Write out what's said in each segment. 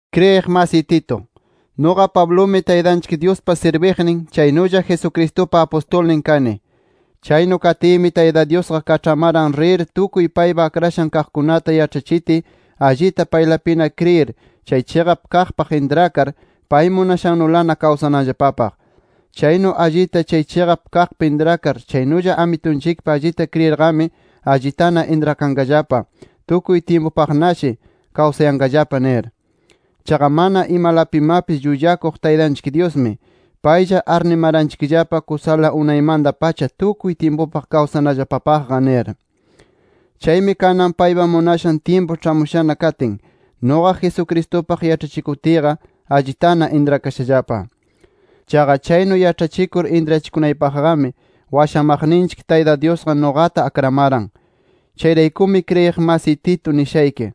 Kriyiq masiy Tito, nuqa Pablumi Taytanchik Dyuspa sirbiqnin, chaynulla Jesucristupa apustulnin kani. Chaynu katiymi Tayta Dyusqa kaĉhamaran rir tukuy paypa akrashan kaqkunata yaĉhachitiy allita paylapina kriyir, chay chiqap kaqpaq intrakar, pay munashannulana kawsananllapapaq. Chaynu allita chay chiqap kaqpi intrakar chaynulla Amitunchikpi allita kriyirqami allitana intrakanqallapa, tukuy tyimpupaqnashi kawsayanqallapa nir. Chaqa mana imalapimapis llullakuq Taytanchik Dyusmi, paylla arnimaranchikllapa kusala unaymanta-pacha tukuy tyimpupaq washamanallapapaq nir. Chaymi kanan paypa munashan tyimpu ĉhamushana katin, nuqa Jesucristupaq yaĉhachikutiyqa allitana intrakashallapa. Chaqa chaynu yaĉhachikur intrachikunaypaqmi washamaqninchik Tayta Dyusqa nuqata akramaran. Chayraykumi kriyiq masiy Tito nishayki: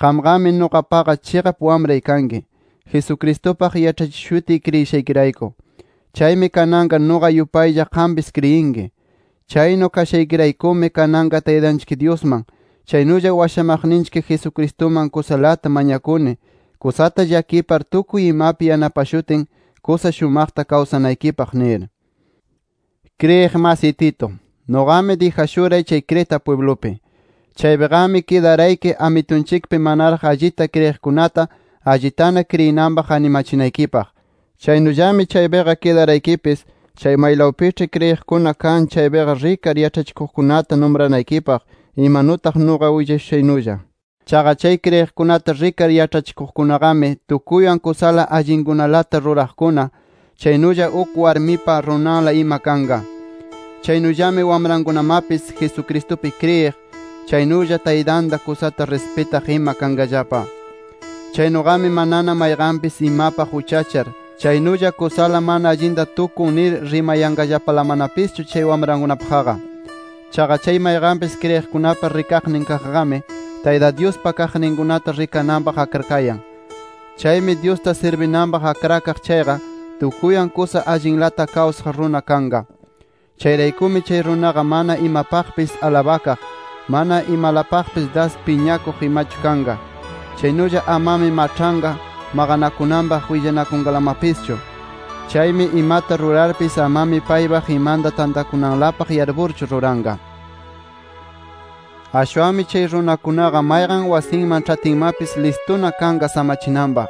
Qamqami nuqapaqa chiqap wamray kanki, Jesucristupaq yaĉhachishutiy kriyishaykirayku. Chaymi kananqa nuqa yupaylla qampis kriyinki. Chaynu kashaykiraykumi kananqa Taytanchik Dyusman, chaynulla washamaqninchik Jesucristuman kusalata mañakuni, kusata llakipar tukuy imapi yanapashutin, kusa shumaqta kawsanaykipaq nir. Kriyiq masiy Tito, nuqami dijashuray Creta pwiblupi. Chaypiqami kidarayki Amitunchikpi manaraq allita kriyiqkunata allitana kriyinanpaq animachinaykipaq. Chaynullami chaypiqa kidaraykipis chay maylawpiĉhi kriyiqkuna kan chaypiqa rikar yaĉhachikuqkunata numranaykipaq imanutaq nuqa nishushaynulla. Chaqa chay kriyiqkunata rikar yaĉhachiqkunaqami, tukuywan kusa allinkunalata ruraqkuna, chaynulla uk warmipa runanla ima kanqa. Chaynullami wamrankunamapis Jesucristupi kriyiq, chaynulla taytanta kusata rispitaq ima kanqallapa. Chaynuqami manana mayqanpis imapaq uchachar, chaynulla kusala mana allinta tukun nir rimayanqallapalamanapischu chay wamrankunapaqqa. Chaqa chay mayqanpis kriyiqkunapa rikaqnin kaqqami, Tayta Dyuspa kaqninkunata rikananpaq akrakayan. Chaymi Dyusta sirbinanpaq akrakaq chayqa, tukuywan kusa allinlata kawsaq runa kanqa. Chayraykumi chay runaqa mana imapaqpis alabakaq, ama imalapaqpis das piñakuq imachu kanqa. Chaynulla amami maĉhanqa, maqanakunanpaq willanakunqalamapischu. Chaymi imata rurarpis amami paypaq imanta tantakunanlapaq yarpurchu ruranqa. Ashwanmi chay runakunaqa mayqan wasinman ĉhatinmapis listuna kanqa samachinanpaq.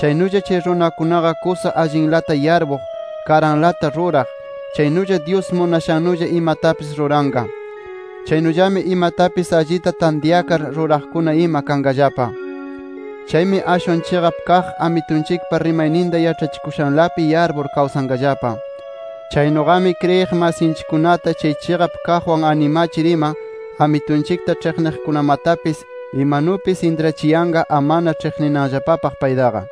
Chaynulla chay runakunaqa kusa allinlata yarpuq, karanlata ruraq, chaynulla Dyus munashannulla imatapis ruranqa. Chaynullami imatapis allita tantyakar ruraqkuna ima kanqallapa. Chaymi ashwan chiqap kaq Amitunchikpa rimayninta yaĉhakushanlapi yarpur kawsanqallapa. Chaynuqami kriyiq masinchikkunata chay chiqap kaqwan animachir ima, Amitunchikta ĉhiqniqkunamatapis imanupis intrachiyanqa amana ĉhiqninanllapapaq paytaqa.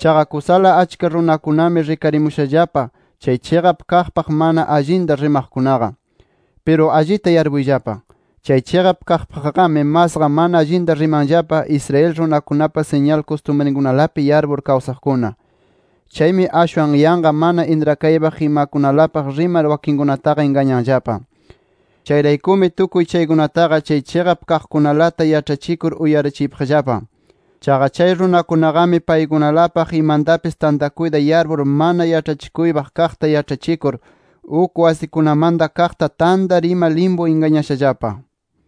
Chaqa kusala achka runakunami rikarimushallapa chay chiqap kaqpaq mana allinta rimaqkunaqa. Piru allita yarpuyllapa: Chay chiqap kaqpaqqami masqa mana allinta rimanllapa Israel runakunapa siñal kustumrinkunalapi yarpur kawsaqkuna. Chaymi ashwan yanqa mana intrakaypaq imakunalapaq rimar wakinkunataqa ingañanllapa. Chayraykumi tukuy chaykunataqa chay chiqap kaqkunalata yaĉhachikur uyarachiypaqllapa. Chaqa chay runakunaqami paykunalapaq imantapis tantakuyta yarpur mana yaĉhachikuypaq kaqta yaĉhachikur, uk wasikunamanta kaqta tantar ima limpu ingañashallapa.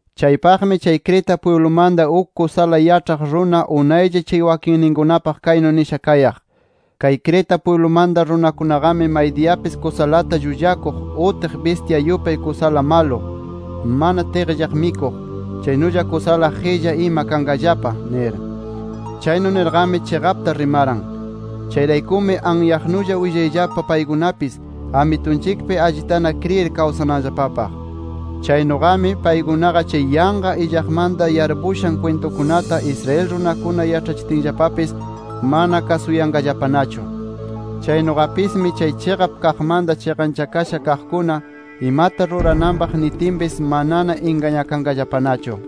Chaypaqmi chay Creta pwiblumanta uk kusala yaĉhaq runa unaylla chay wakinninkunapaq kaynu nisha kayaq: “Kay Creta pwiblumanta runakunaqami, maydiyapis kusalata llullakuq, utiq bistya yupay kusala malu, mana tiqllaq mikuq, chaynulla kusala qilla ima kanqallapa” nir. Chaynu nirqami, chiqapta rimaran. Chayraykumi anyaqnulla willayllapa paykunapis Amitunchikpi allitana kriyir kawsananllapapaq. Chaynuqami, paykunaqa chay yanqa illaqmanta yarpushan kwintukunata Israel runakuna yaĉhachitinllapapis mana kasuyanqallapanachu. Chaynuqapismi chay chiqap kaqmanta chiqanchakasha kaqkuna imata rurananpaq nitinpis manana ingañakanqallapanachu.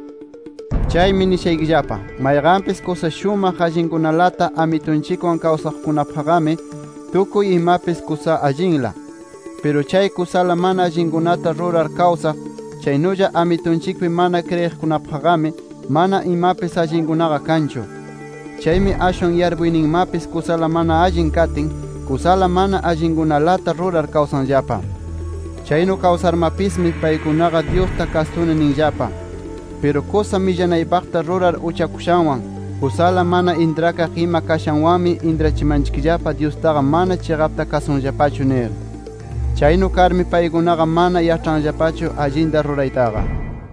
Chaymi nishaykillapa: Mayqanpis kusa shumaq allinkunalata Amitunchikwan kawsaqkunapaqqami, tukuy imapis kusa allinla. Piru chay kusala mana allinkunata rurar kawsaq, chaynulla Amitunchikpi mana kriyiqkunapaqqami mana imapis allinkunaqa kanchu. Chaymi ashwan yarpuyninmapis kusala mana allin katin, kusala mana allinkunalata rurar kawsanllapa. Chaynu kawsarmapismi paykunaqa Dyusta kasuni ninllapa. Piru kusa millanaypaqta rurar uchakushanwan, kusala mana intrakaq ima kashanwanmi intrachimanchikllapa Dyustaqa mana chiqapta kasunllapachu nir. Chaynu karmi paykunaqa mana yaĉhanllapachu allinta ruraytaqa.